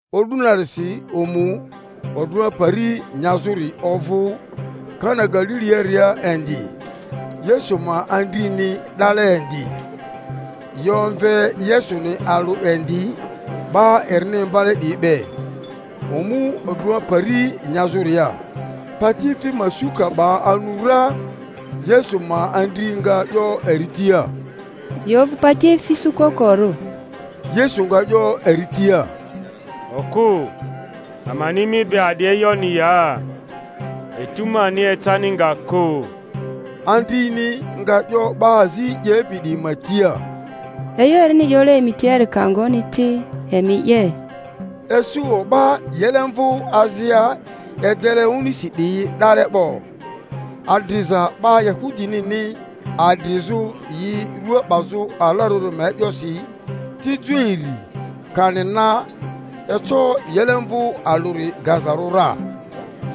O'du narisi omu odrᴜa pari nyazᴜri ovᴜ Kana Galiliaria indi; Yesu ma andrini 'dale indi; yi omve Yesuni alᴜ indi 'ba erini imbale 'diyi be, omu odrᴜa pari nyazᴜria. Patiefi ma su ka 'ba anu ra, Yesu ma andri nga 'yo eri tia, Yi ovᴜ patiefi su kokorᴜ. Yesu nga 'yo eri tia, Okᴜ, amani mi be a'di e'yoni ya? Etu mani ecani nga kᴜ. Andrini nga 'yo 'ba azi 'yepi 'diyi ma tia, E'yo erini 'yole emi tiari ka ngoni ti, emi 'ye. Isu o'ba yilemvᴜ azia edele onisi 'diyi 'dale 'bo, adriza 'ba Yahudinini adrizᴜ yi rua 'bazᴜ alarᴜri ma e'yosi, tijo iri kani na eco yilemvᴜ alᴜri gazarᴜ ra.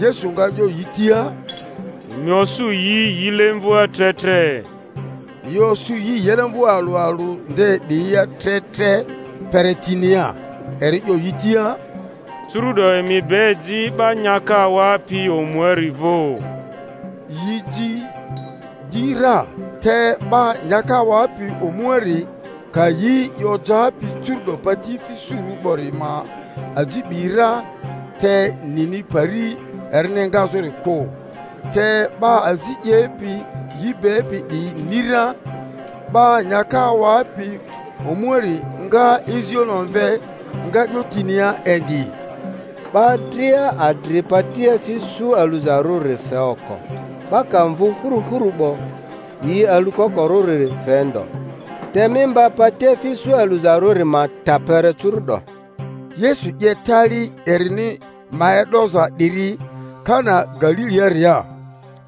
Yesu nga 'yo yi tia, Emi osᴜ yi yilemvᴜa tre tre. Yi osᴜ yi yilemvᴜ alᴜ alᴜ nde 'diyia tre tre kpere tinia. Eri 'yo yi tia, Curu'do emi be ji 'ba nyaka awapi omuari vᴜ. Y i ji di ra. Te 'ba nyaka awapi omuari ka yi i ojapi curu'do patiefi surᴜ 'bori ma aji 'bi ra, te nini pari erini engazᴜri kᴜ (te 'ba azi 'yepi yi bepi 'diyi ni ra), 'ba nyaka awapi omuari nga izioni omve, nga 'yo tinia indi, 'Ba dria adri patiefi su aluzarᴜri fe oko; 'ba ka mvu hurᴜhuru 'bo, yi alukokorᴜri fe ndo; te mi mba patiefi su aluzarᴜri ma ta kpere curu'do. Yesu 'ye tali erini ma e'doza 'diri Kana Galiliaria,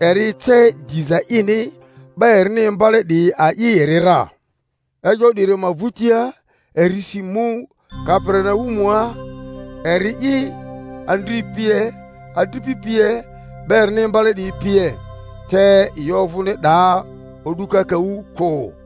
eri ece diza ini; 'ba erini imbale 'diyi a'i eri ra. E'yo 'diri ma vᴜtia, eri si mu Kaperinaumua, eri'i, andri pie, adripi pie, 'ba erini imbale 'diyi pie; te yi ovᴜni 'daa o'du kakaᴜ kᴜ.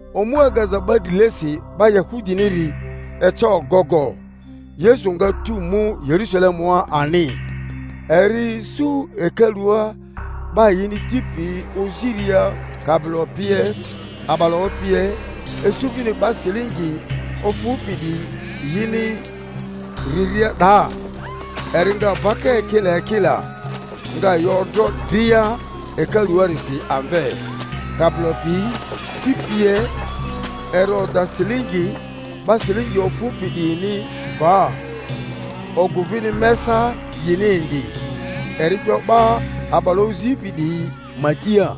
Omu agaza 'ba drilesi 'ba Yahudiniri eca ogogo; Yesu nga tu mu Yerusalemua ani. Eri isu hekalua 'ba yini ti piyi oziria kabilo pie, a'balaᴜ pie, isu vini 'ba silingi ofᴜpi 'diyi yini riria 'daa. Eri nga baka ekila ekila, nga yi odro dria hekaluarisi amve, kabilo piyi, ti pie; eri oda silingi 'ba silingi ofᴜpi 'diyini va, ogᴜ vini mesa yini indi. Eri 'yo 'ba a'balaᴜ ozipi 'diyi ma tia,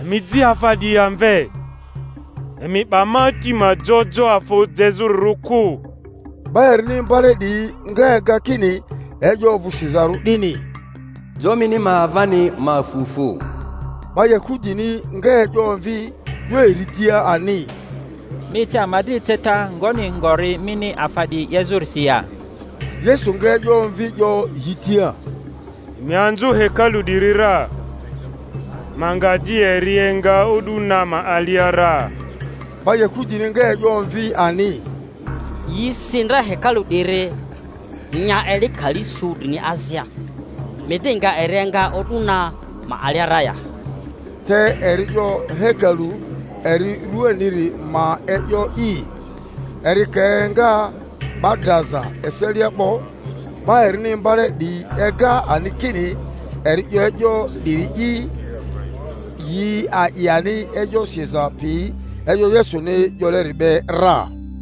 Emi ji afa 'diyi amve; emi 'ba ma Ati ma jo jo afa jezᴜrirᴜ kᴜ. 'Ba erini imbale 'diyi nga ega kini e'yo ovᴜ sizarᴜ 'dini, Jo mini ma avani ma fu fu. 'Ba Yahudini nga e'yo omvi, 'yo eri tia ani, Mi ece ama dri eceta ngoni ngori mini afa 'diyi 'yezᴜrisi ya? Yesu nga e'yo omvi 'yo yi tia, Emi anzᴜ hekalu 'diri ra, ma nga di eri enga o'du na ma alia ra. 'Ba Yahudini nga e'yo omvi ani, Yi si ndra hekalu 'diri, nya eli kali su drini azia; mi di nga eri enga o'du na ma alia ra ya? Te eri 'yo hekalu eri rᴜaniri ma e'yo'i. Eri ka enga 'ba draza eselia 'bo, 'ba erini imbale 'diyi ega ani kini eri 'yo e'yo 'diri'i; yi a'i ani e'yo siza pi e'yo Yesuni 'yoleri be ra.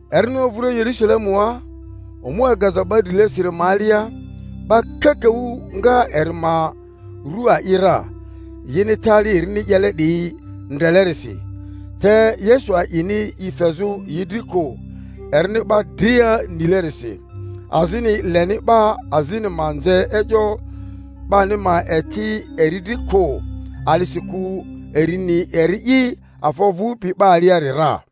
Erini ovᴜria Yerᴜsalemua, omu agaza 'ba drilesiri ma alia, 'ba kakaᴜ nga eri ma ru a'i ra, yini tali erini 'yele 'diyi ndrelerisi; te Yesu a'ini i fezᴜ yi dri kᴜ, erini 'ba dria nilerisi, azini leni 'ba azini ma nze e'yo 'bani ma eti eri dri kᴜ; a'disikᴜ eri ni eri'i afa ovᴜpi 'ba aliari ra.